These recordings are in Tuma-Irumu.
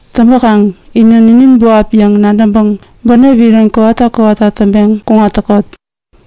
Täŋpäkaŋ inä ninin buap yäŋ nadäŋpäŋ bänep iron kowata kowata täŋpeŋ kuŋat täkot.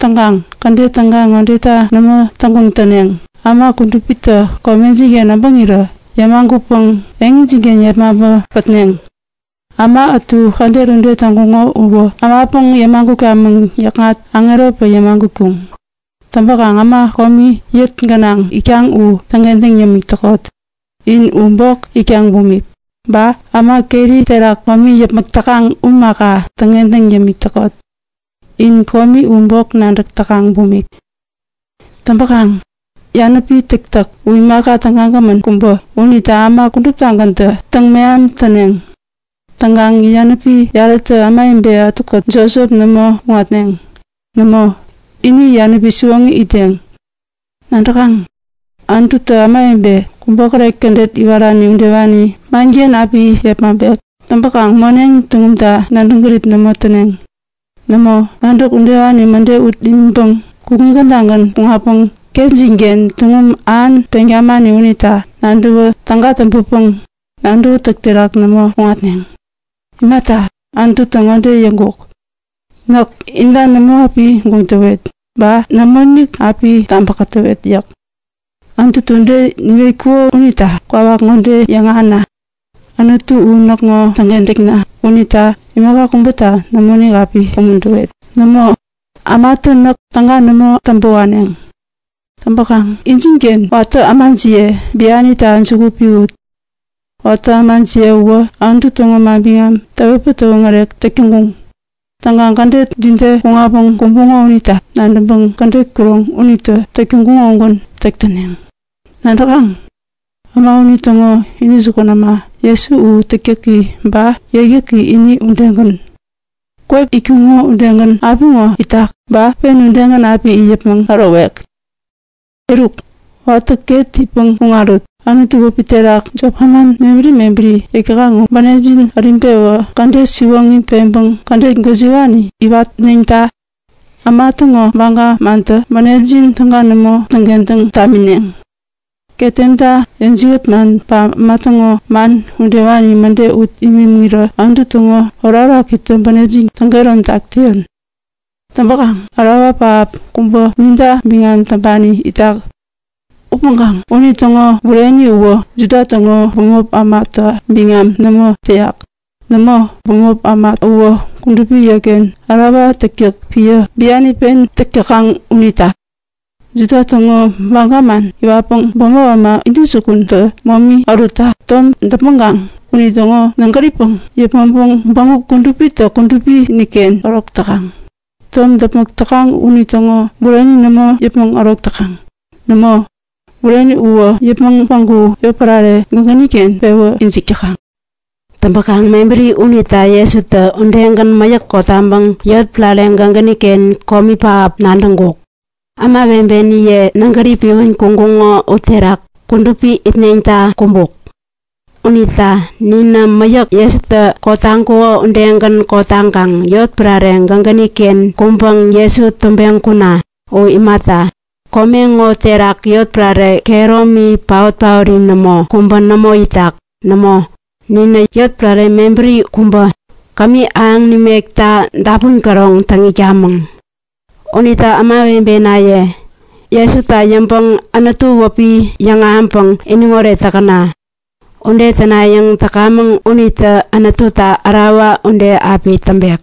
Täŋkaŋ kädet täga ŋodeta nämo täŋguŋ täneŋ; Äma kudupitä komejin-ken äbäŋirä yämagutpäŋ eŋijin-ken yepmaŋpä pätneŋ. Äma ätu kädet ude täŋkuŋo uwä ämapäŋ yämagutkamäŋ yäkŋat aŋeropäŋ yämagutkuŋ. Täŋpäkaŋ äma komi eŋi gänaŋ itkaŋ u täŋkentäŋ yämik täkot, in u bok itkaŋ bumik. Ba äma keri terak komi yäpmäk täkaŋ u imaka, täŋkentäŋ yämik täkot, in komi u bok nadäk täkaŋ bumik. Täŋpäkaŋ yanäpi täktäk u imaka tägagämän kubä unita äma kuduptagäntä täŋmeham täneŋ. Täŋkaŋ yanäpi yarätä ämawebe ätukät jopjop nämo kuŋatneŋ. Nämo, ini yanäpi siwoŋi itdeŋ. Nadäkaŋ? Anututä ämawebe kubokäret kädet iwarani udewani manken api yepmaŋpek. Täŋpäkaŋ moneŋ tuŋumta nadäŋ gärip nämo täneŋ. Nämo, nadäk udewani mäde ut imiŋpäŋ kukŋi kädagän kuŋatpäŋ ketjin-ken tuŋum ähan peŋ tamani unita nadäwä täga täŋpäpäŋ nadäwätäk terak nämo kuŋatneŋ. Imata, Anututä ŋode yäŋkuk; Näk inta nämo api guŋ täwet, ba nämoinik api tabä kätäwet yäk. Anututä ude niwetkuko unita kwawak ŋode yäŋahäna; Anutu u näkŋo täŋkentäkna unita imaka kubäta nämoinik api umuntäwet. Nämo, ämatä näk täga nämo täŋpä waneŋ. Täŋpäkaŋ injinken watä ämajiye bianita juku piwut. Watä ämajiye uwä Anutu täŋo manbiŋam täwetpäŋ täwoŋärek täk täŋkuŋ. Täŋkaŋ kädet jide kuŋatpäŋ kumbuŋo unita nadäŋpäŋ kädet kuroŋ unitä täk täŋkuŋo udegän täk täneŋ. Nadäkaŋ? Äma unitäŋo intäjukun äma Jesu u täktäki ba yäkyäki ini udegän. Kwep itkuko udegän apiŋo itak, ba pen udegän api it yäpmäŋ ärowek. Eruk, watä ket itpäŋ kuŋarut. Anutu wäpi terak jop manman mebäri mebäri yäk täkaŋ u bänepjin äriŋpewän kädet siwoŋi peŋpäŋ kädet gwäjiwani iwatneŋta! Äma täŋo baga mantä bänepjin täga nämo täŋkentäŋ tamineŋ. Ketemta yäjiwät man ba äma täŋo man udewani mäde ut imiŋirä Anutu täŋo orakorakitä bänepjin täŋ-kehäromtak täyon. Täŋpäkaŋ ärawa pähap kubä ninta biŋam täŋpani itak. Upäŋkaŋ unitäŋo bureni uwä Juda täŋo bämop ämata biŋam nämo täyak. Nämo, bämop äma uwä kudupi yotken ärawa täktäk piä biani pen täk täkaŋ unita. Juda täŋo baga man iwatpäŋ bämop äma intäjukun täŋpanitä momi ärutta tom däpmäŋkaŋ unitäŋo nägäripäŋ yäpmäŋpäŋ Bägup Kudupitä Kudupi-inik-ken ärok täkaŋ. Tom däpmäk täkaŋ unitäŋo bureni nämo yäpmäŋ ärok täkaŋ. Nämo, bureni uwä yäpmäŋ päŋku yotpärare gägäni-ken pewä ijik täkaŋ. Täŋpäkaŋ mebäri unita Jesutä udegän, mäyäk kotaŋpäŋ yotpärare gägäni-ken komi pähap nadäŋkuk. Ämawebeniye nägäri piwän kuŋkuŋo uterak kudupi-inik itneŋta kumbuk. Unita ninä mäyäk Jesutä kotaŋkuko udegän kotaŋkaŋ yotpärare gägäni-ken kuŋpäŋ Jesu tubeŋ kuna! U imata, kome ŋo terak yotpärare kehäromi paot-paori nämo, kubä nämo itak. Nämo, ninä yotpärare mebäri kubä, kämi ahäŋ nimekta dapun käroŋ täŋ itkamäŋ. Unita ämawebenaye, Jesuta nadäŋpäŋ Anutu wäpi yäŋahäŋpäŋ iniŋoret täkäna! Ude tänayäŋ täkamäŋ unitä Anututa ärawa ude api täŋpek.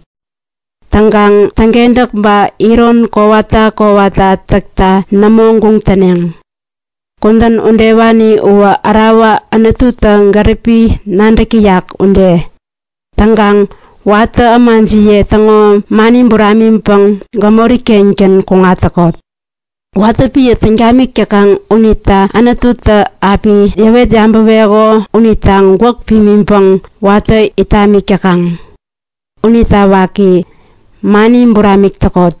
Täŋkaŋ täŋkentäk ba iron kowata kowata täkta nämo guŋ täneŋ. Kudän udewani uwä ärawa Anututä gäripi nadäk täyak ude. Täŋkaŋ watä ämajiye täŋo mani buramiŋpäŋ gämori-kengän kuŋat täkot. Watä piä täŋ tamik täkaŋ unita Anututä api yäwet yabäweko unita gwäk pimiŋpäŋ watä it tamik täkaŋ. Unita waki, mani buramik täkot.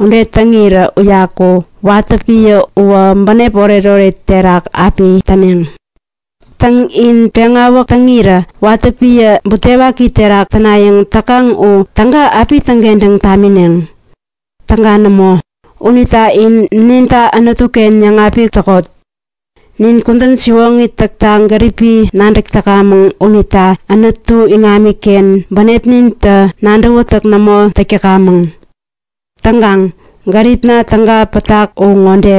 Ude täŋirä uyaku watä piä uwä bänep oretoret terak api täneŋ. Täŋ, in peŋawäk täŋirä watä piä butewaki terak tänayäŋ täkaŋ u täga api täŋkentäŋ tamineŋ? Täga nämo! Unita in ninta Anutu-ken yäŋapik täkot. Nin kudän siwoŋi täkta gäripi nadäk täkamäŋ unita Anutu iŋamiken bänepnintä nadäwätäk nämo täk täkamäŋ. Täŋkaŋ gäripna täŋi pätak u ŋode;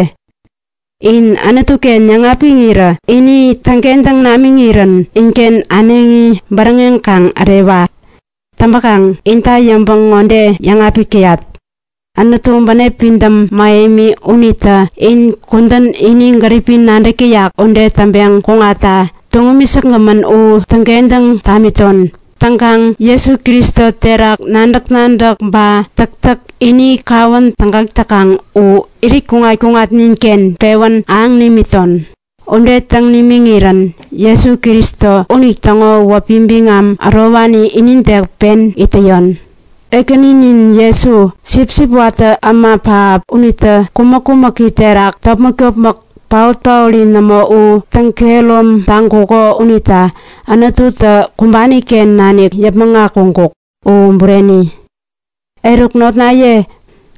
In Anutu-ken yäŋapiŋirä ini täŋkentäŋ namiŋirän inken äneŋi bäräŋeŋ kaŋ ärewa! Täŋpäkaŋ inta yäŋpäŋ ŋode yäŋapik täyat; Anutu bänep pidäm mähemi unitä in kudän ini gäripi nadäk täyak ude täŋpeŋ kuŋatta tuŋumi säkgämän u täŋkentäŋ tamiton. Täŋkaŋ Jesu Kristo terak nadäk-nadäk ba täktäk ini kawän tägak täkaŋ u irit kuŋat-kuŋatnin-ken pewän ahäŋ nimiton! Ude täŋ nimiŋirän Jesu Kristo unitäŋo wäpi biŋam ärowani inide pen it täyon. Ekäninin Jesu, Sipsip watä äma pähap unitä kumäk-kumäki terak topmäk-topmäk paot-paori nämo u täŋkehärom taŋkuko unita Anututä kumbani-ken nanik yäpmäŋ akuŋkuk. U Bureni. Eruk notnaye,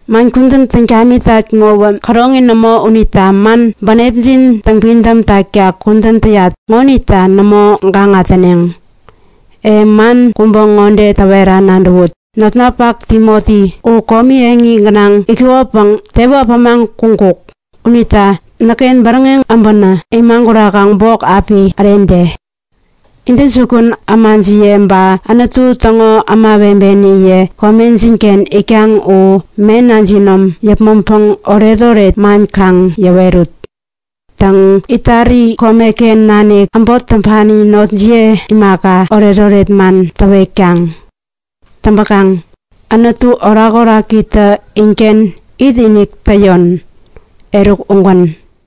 man kudän täŋ tamitat ŋowä käroŋi nämo unita man bänepjin täŋpidäm takta kudän täyat ŋonita nämo gaŋa täneŋ. E man kubä ŋode täwera nadäwut; Notninpak Timoti u komi eŋi gänaŋ itkukopäŋ tewä äpämaŋ kuŋkuk. Unita näkken bäräŋeŋ äbänä imagurakaŋ bok api ärede. Intäjukun ämajiye ba Anutu täŋo kudupi ämawebeniye komejin-ken itkaŋ u mena jinom yäpmäŋpäŋ oretoret man kaŋ yäwerut. Täŋ, Itali komeken nanik äbot täŋpani notniye imaka, oretoret man täwetkaŋ. Täŋpäkaŋ Anutu täŋo orakorakitä inken itinik täyon. Eruk, ugän.